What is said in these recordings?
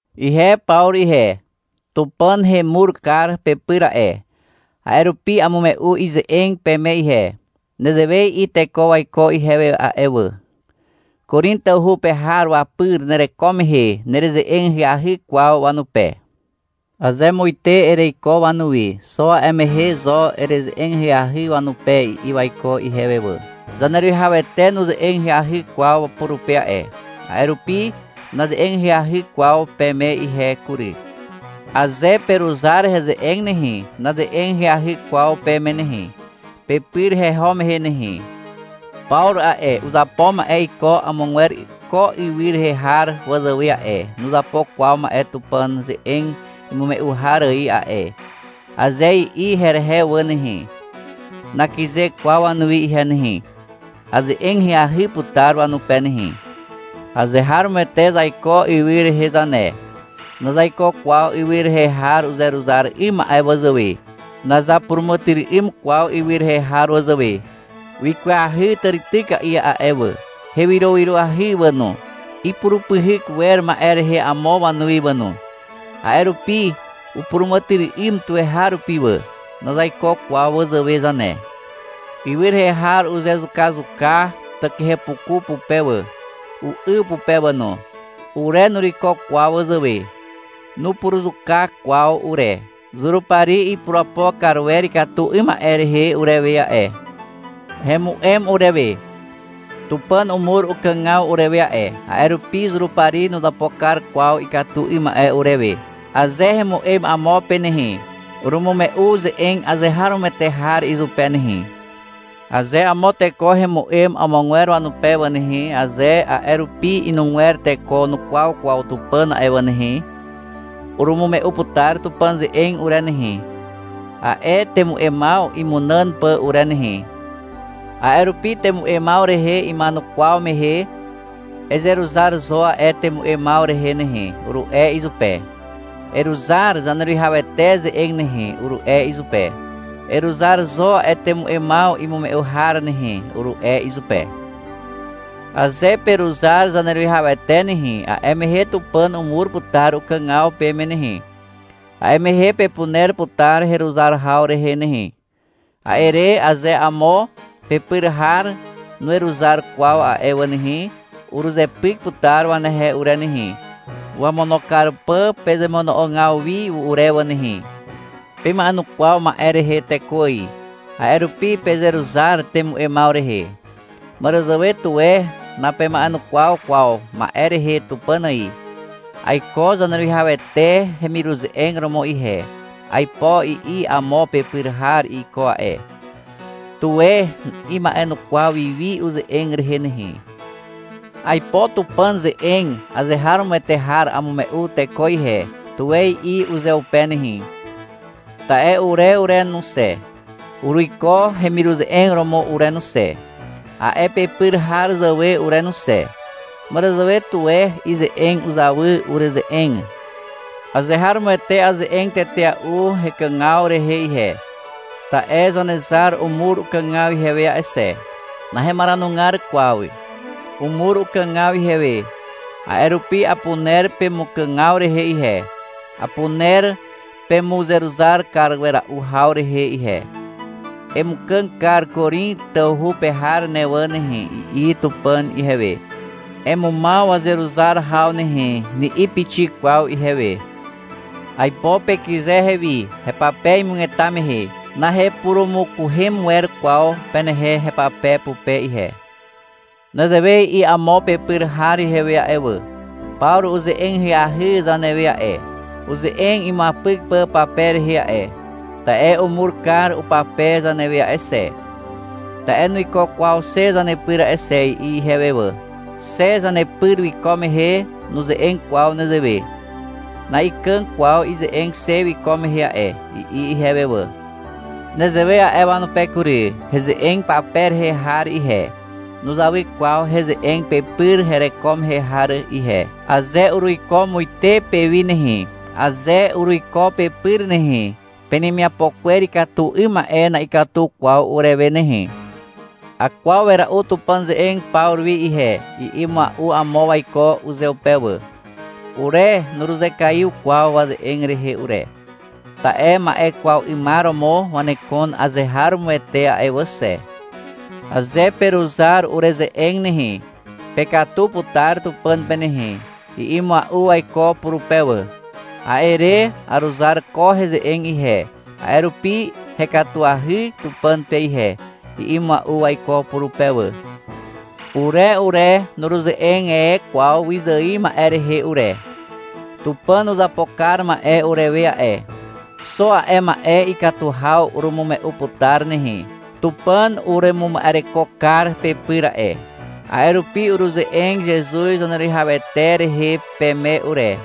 Ihe Pawru ihe. Tupàn hemur kar pepyr a'e. A'e rupi amume'u ize'eg peme ihe. Nezewe i'i teko waiko ihewe a'e wà. — Korin tawhu pe har wapyr nereko mehe nereze'eg ahyahy kwaw wanupe. Aze muite ereiko wanuwi, xo a'e mehe zo ereze'eg ahyahy wanupe, i'i waiko ihewe wà. Zaneruwihawete nuze'eg ahyahy kwaw purupe a'e, a'e rupi naze'eg ahyahy kwaw peme ihe kury. Aze peruzar heze'eg nehe, naze'eg ahyahy kwaw peme nehe, pepyr heho mehe nehe. — Pawru a'e, uzapo ma'e iko amogwer ko ywy rehe har wazàwe a'e, nuzapo kwaw ma'e Tupàn ze'eg imume'u har ài a'e, aze i'i herehe wà nehe, nakyze kwaw wanuwi ihe nehe. Aze'eg ahyahy putar wanupe nehe. Azeharomoete zaiko ywy rehe zane. Nazaiko kwaw ywy rehe har uzeruzar 'ym ma'e wazàwe. Nazapuràmàtyry'ym kwaw ywy rehe har wazàwe. Wikwahy tàrityka'i a'e wà. Hewyrowyroahy wà no. Ipurupyhyk wer ma'e rehe amo wanuwi wà no. A'e rupi upuràmàtyry'ym tuweharupi wà. Nazaiko kwaw wazàwe zane. Ywy rehe har uzezukazuka takihepuku pupe wà, u'yw pupe wà no. Ure nuruiko kwaw wazàwe. Nurupuruzuka kwaw ure. Zurupari ipurapo kar wer ikatu 'ym ma'e rehe urewe a'e. Hemu'em urewe. Tupàn umur ukàgaw urewe a'e, a'e rupi Zurupari nuzapo kar kwaw ikatu 'ym ma'e urewe. Aze hemu'em amo pe nehe, urumume'u ze'eg azeharomoete har izupe nehe. Aze amo teko hemu'em amogwer wanupe wà nehe, aze a'e rupi inugwer teko nukwaw kwaw Tupàn a'e wà nehe, urumume'u putar Tupàn ze'eg ure nehe, a'e temu'emaw imunàn pà ure nehe. A'e rupi temu'emaw rehe ima'enukwaw mehe, — Ezeruzar zo a'e temu'emaw rehe nehe, uru'e izupe. — Eruzar Zaneruwihawete ze'eg nehe, uru'e izupe. — Eruzar zo a'e temu'emaw imume'u har nehe, uru'e izupe. — Aze peruzar Zaneruwihawete nehe, a'e mehe Tupàn umur putar ukàgaw peme nehe, a'e mehe pepuner putar heruzar haw rehe nehe. A'e re, aze amo pepyr har nuweruzar kwaw a'e wà nehe, uruzepyk putar wanehe ure nehe, (wamono kar pà pezemono'ogaw wi ure wà nehe). Pema'enukwaw ma'e rehe teko ài. (A'e rupi pezeruzar temu'emaw rehe.) Màràzàwe tuwe napema'enukwaw kwaw ma'e rehe Tupàn ài. — Aiko Zaneruwihawete hemiruze'eg romo ihe, aipo i'i amo pepyr har iko a'e. Tuwe ima'enukwaw wi wi uze'eg rehe nehe. — Aipo Tupàn ze'eg azeharomoete har amume'u teko ihe, tuwe i'i uzeupe nehe. Ta'e ure ure no xe, uruiko hemiruze'eg romo ure no xe, a'e pepyr har zàwe ure no xe. (Màràzàwe tuwe ize'eg uzawy ureze'eg.) Azeharomoete aze'eg tetea'u hekàgaw rehe ihe, ta'e Zanezar umur ukàgaw ihewe a'e xe. Nahemaranugar kwaw. Umur ukàgaw ihewe, a'e rupi apuner pemukàgaw rehe ihe, apuner pemuzeruzar kar wera'u haw rehe ihe. — Emukàg kar Korin tawhu pe har ne wà nehe, i'i Tupàn ihewe. — Emumaw wazeruzar haw nehe, ni'i pixik kwaw ihewe. Aipo pekyze ihewi, hepape imugeta mehe. Nahepurumukuhem wer kwaw penehe hepape pupe ihe. Nezewe i'i amo pepyr har ihewe a'e wà. — Pawru uze'eg ahyahy zanewe a'e, uze'eg imuapyk pà pape rehe a'e. Ta'e umur kar upape zanewe a'e xe. Ta'e nuiko kwaw xe zanepyr a'e xe, i'i ihewe wà. — Xe zanepyr wiko mehe nuze'eg kwaw nezewe. Na'ikàg kwaw ize'eg xe wiko mehe a'e, i'i ihewe wà. Nezewe a'e wanupe kury. Heze'eg pape rehe har ihe, nuzawy kwaw heze'eg pepyr hereko mehe har ihe. Aze uruiko muite pewi nehe, aze uruiko pepyr nehe, penemiapo kwer ikatu 'ym ma'e na'ikatu kwaw urewe nehe. — Akwaw wera'u Tupàn ze'eg Pawru wi ihe, i'i mua'u amo waiko uzeupe wà. Ure nuruzekaiw kwaw waze'eg rehe ure. Ta'e ma'e kwaw 'ymar romo wanekon azeharomoete a'e wà xe. — Aze peruzar ureze'eg nehe, pekatu putar Tupàn pe nehe, i'i mua'u waiko purupe wà. A'e re, — Aruzar ko heze'eg ihe, a'e rupi hekatuahy Tupàn pe ihe, i'i mua'u waiko purupe wà. Ure ure, nuruze'eg e kwaw wyzài ma'e rehe ure. Tupàn uzapo kar ma'e urewe a'e. Xo a'e ma'e ikatu haw urumume'u putar nehe. Tupàn uremuma'ereko kar pepyr a'e. A'e rupi uruze'eg Zezuz Zaneruwihawete rehe peme ure.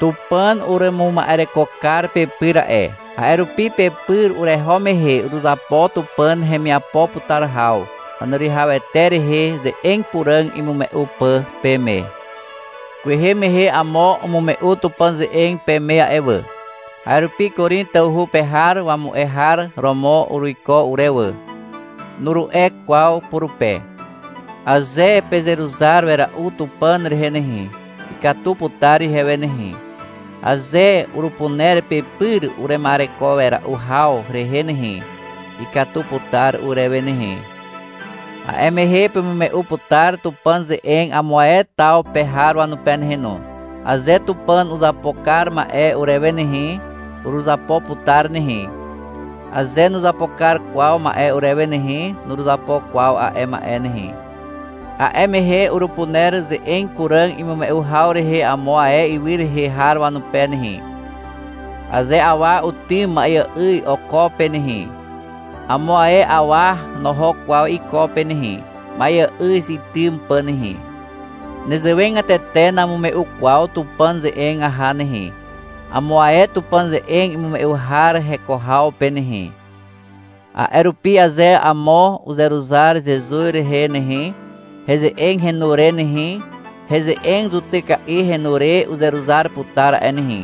Tupàn uremuma'ereko kar pepyr a'e. A'e rupi pepyr ureho mehe uruzapo Tupàn hemiapo putar haw, Zaneruwihawete rehe ze'eg puràg imume'u pà peme. Kwehe mehe amo umume'u Tupàn ze'eg peme a'e wà. A'e rupi — Korin tawhu pe har wamu'e har romo uruiko ure wà, nuru'e kwaw purupe. Aze pezeruzar wera'u Tupàn rehe nehe, ikatu putar ihewe nehe. Aze urupuner pepyr urema'ereko wera'u haw rehe nehe, ikatu putar urewe nehe. A'e mehe pemume'u putar Tupàn ze'eg amo ae taw pe har wanupe nehe no. Aze Tupàn uzapo kar ma'e urewe nehe, uruzapo putar nehe. Aze nuzapo kar kwaw ma'e urewe nehe, nuruzapo kwaw a'e ma'e nehe. A'e mehe urupuner ze'eg puràg imume'u haw rehe amo ae ywy rehe har wanupe nehe. Aze awa utym ma'eà'yz oko pe nehe, amo ae awa noho kwaw iko pe nehe, ma'eà'yz itym pà nehe. Nezewegatete namume'u kwaw Tupàn ze'eg aha nehe, amo ae Tupàn ze'eg imume'u har heko haw pe nehe. A'e rupi aze amo uzeruzar Zezuz rehe nehe, heze'eg henu re nehe, heze'eg zutyka'i henu re uzeruzar putar a'e nehe.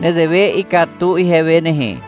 Nezewe ikatu ihewe nehe.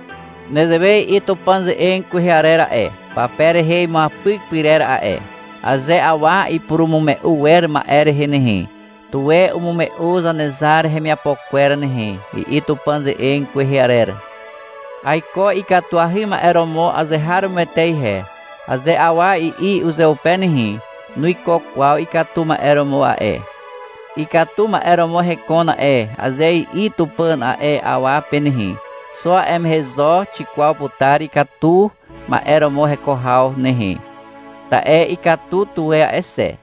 Nezewe i'i Tupàn ze'eg kwehe arer a'e, pape rehe imuapyk pyrer a'e. — Aze awa ipurumume'u wer ma'e rehe nehe, tuwe umume'u Zanezar hemiapo kwer nehe, i'i Tupàn ze'eg kwehe arer. — Aiko ikatuahy ma'e romo azeharomoete ihe, aze awa i'i uzeupe nehe, nuiko kwaw ikatu ma'e romo a'e. — Ikatu ma'e romo hekon a'e, aze i'i Tupàn a'e awa pe nehe, xo a'e mehe zo xikwaw putar ikatu ma'e romo heko haw nehe. Ta'e ikatu tuwe a'e xe.